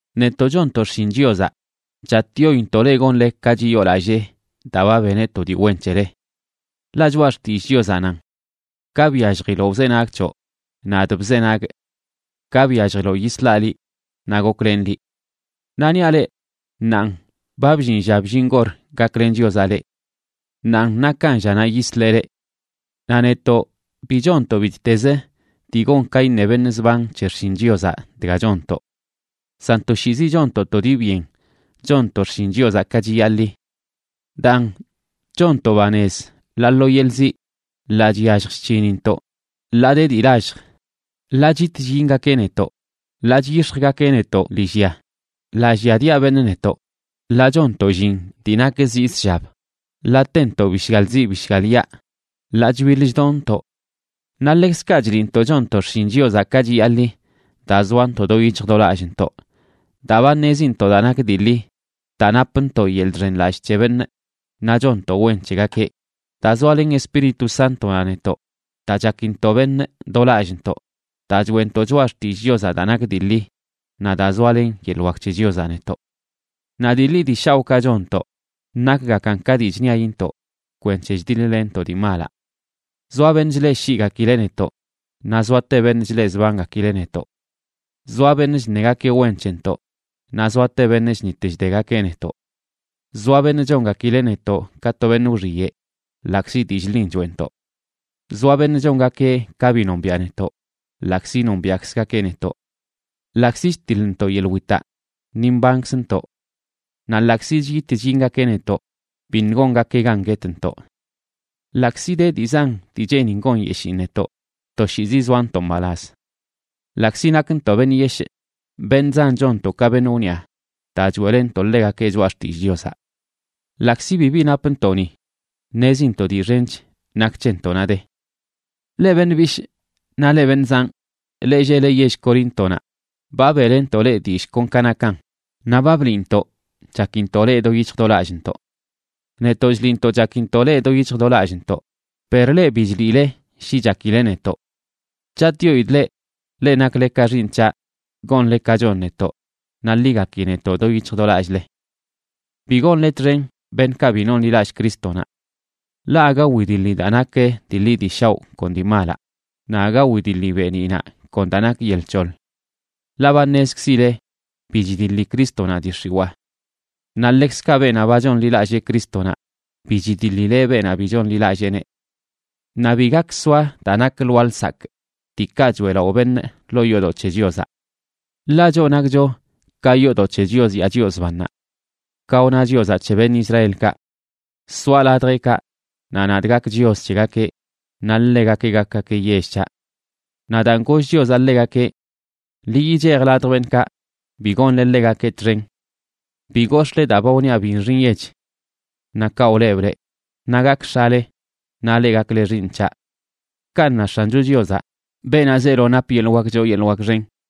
Netoꞌ chonntoꞌ xshin Chiozaꞌ, chatꞌyointoꞌ leꞌ gonle ka chiyoolallee daa ba beneꞌ to dii wen c̱hele. Ḻaꞌ Choꞌa Xtillꞌ Chiozaꞌ nan: Ka byalljiloꞌ wzenagꞌ c̱hoꞌ, nadꞌ bzenagꞌ. Ka byalljiloꞌ yislaꞌ liꞌ naꞌ goklenꞌ liꞌ. Naꞌ niaꞌ leꞌ, ṉaanꞌ ba bllin lla bllin gor gaklen Chiozaꞌ leꞌ. Ṉaanꞌ nakan llanaꞌ yisleꞌ leꞌ. Naꞌ netoꞌ bi chonntoꞌ bittez dii gon ka iṉe beṉꞌ zban c̱he xshin Chiozaꞌ dga chonntoꞌ. San toshiizi chonntoꞌ to dii byen chonntoꞌ xshin Chiozaꞌ ka chiyaḻi. Daan, chonntoꞌ banez ḻaa lo yeḻꞌ ziꞌ, ḻaa chyallj chc̱hinintoꞌ, ḻaa de dii lallj, ḻaa chit chyingakeꞌ netoꞌ, ḻaa chyix̱jgakeꞌ netoꞌ lillya, ḻaa lliadiaꞌ beṉꞌ netoꞌ, ḻaa chonntoꞌ llin dii nak zii zshab, ḻaa tentoꞌ bishgal ziꞌ bishgal yaꞌ, ḻaa chbiḻ chdonntoꞌ. Naꞌ ḻekzkaꞌ chliꞌntoꞌ chonntoꞌ xshin Chiozaꞌ ka chiyaḻi daa zoantoꞌ do yic̱hj do lallꞌntoꞌ, daa ba ṉezintoꞌ daa nak dii ḻi, daa napntoꞌ yeḻꞌ chxenlallꞌ c̱he beṉꞌ naꞌ chonntoꞌ wen c̱hegakeꞌ, daa zoalen Espíritu Sántonaꞌ netoꞌ, daa chakintoꞌ beṉꞌ do lallꞌntoꞌ, daa choeꞌntoꞌ choꞌa xtillꞌ Chiozaꞌ daa nak dii ḻi, naꞌ daa zoalen yeḻꞌ wak c̱he Chiozaꞌ netoꞌ. Naꞌ dii ḻi dii shaoꞌkaꞌ chonntoꞌ nakgakan ka dii chṉiayintoꞌ kwenc̱he chdiḻ-lenntoꞌ dii malaꞌ. Zoa beṉꞌ chleꞌshiꞌgakileꞌ netoꞌ, naꞌ zoate beṉꞌ chleꞌzbangakileꞌ netoꞌ. Zoa beṉꞌ chṉegakeꞌ wen c̱hentoꞌ, naꞌ zoate beṉꞌ chṉit chdegakeꞌ netoꞌ. Zoa beṉꞌ chongakileꞌ netoꞌ ka to beṉꞌ wxiyeꞌ, ḻaꞌkzi dillꞌ ḻin choeꞌntoꞌ. Zoa beṉꞌ chongakeꞌ ka bi nombiaꞌ netoꞌ, ḻaꞌkzi nombiaꞌkzgakeꞌ netoꞌ. Ḻaꞌkzi chtiḻntoꞌ yeḻꞌ witaꞌ, ni mbankzntoꞌ. Naꞌ ḻaꞌkzi chit chyingakeꞌ netoꞌ, biṉꞌ gongakeꞌ gan guetntoꞌ. Ḻaꞌkzi de dii zan dii cheenin gonyeshiin netoꞌ, toshiizi zoantoꞌ mbalaz. Ḻaꞌkzi nakntoꞌ beṉꞌ yeshꞌ, beṉꞌ zan chonntoꞌ ka beṉꞌ wniꞌa daa choeꞌlenntoꞌ ḻegakeꞌ choꞌa xtillꞌ Chiozaꞌ. Ḻaꞌkzi bibi napntoꞌ ni, ṉezintoꞌ dii xench nak c̱hentoꞌnaꞌ de. Leꞌ beṉꞌ bishꞌ naꞌ leꞌ beṉꞌ zanꞌ, leꞌ lleꞌle yell Coríntonaꞌ, ba beꞌlentoꞌ leꞌ dillꞌ kon ka nakan naꞌ ba bliꞌntoꞌ chakintoꞌ leꞌ do yic̱hj do lallꞌntoꞌ. Netoꞌ chliꞌntoꞌ chakintoꞌ leꞌ do yic̱hj do lallꞌntoꞌ, per leꞌ, bi chliꞌle shi chakile netoꞌ. Chatꞌyoidꞌ leꞌ, leꞌ nakle ka xiiṉ c̱haꞌ, gonle ka chon netoꞌ naꞌ ḻi gaki netoꞌ do yic̱hj do lallꞌle. Bi gonle txen beṉꞌkaꞌ bi nonḻilallꞌ Crístonaꞌ. Ḻaꞌ aga widiḻi daa nak dii ḻi dii shaoꞌ kon dii malaꞌ, naꞌ aga wdiḻi beeniꞌnaꞌ kon daa nak yel c̱hoḻ. Ḻaꞌ ba ṉezkzile bi chidiḻi Crístonaꞌ dii x̱iwaa. Naꞌ ḻekzkaꞌ beenaꞌ ba chonḻilallee Crístonaꞌ bi chidiḻileꞌ beenaꞌ bi chonḻilalleeneꞌ. Naꞌ bi gak soa daa nak lwaa lsakꞌ, diikaꞌ choeꞌlaꞌo beṉꞌ, ḻoo yoodoꞌ c̱he Chiozaꞌ. Ḻaꞌ choꞌ nakcho ka yoodoꞌ c̱he Chios yaa Chios bannaꞌ. Ka wna Chiozaꞌ c̱he beṉꞌ Israelkaꞌ: Soaꞌ ladjeꞌkaꞌ, naꞌ nadꞌ gak Chios c̱hegakeꞌ naꞌ ḻegakeꞌ gakgakeꞌ yell c̱haꞌ. Naꞌ daan goll Chiozaꞌ ḻegakeꞌ: Ḻi yichej ladj beṉꞌkaꞌ, bi gonle ḻegakeꞌ txen. Bi gox̱ꞌle daa ba wniaꞌ bi nxi nyech. Naꞌ kaꞌ wlebꞌ leꞌ, naꞌ gakꞌ X̱ale, naꞌ leꞌ gakle xiiṉ c̱haꞌ. Kanꞌ na X̱ancho Chiozaꞌ, beenaꞌ zeelo nap yeḻꞌ wak choo yeḻꞌ wak xen.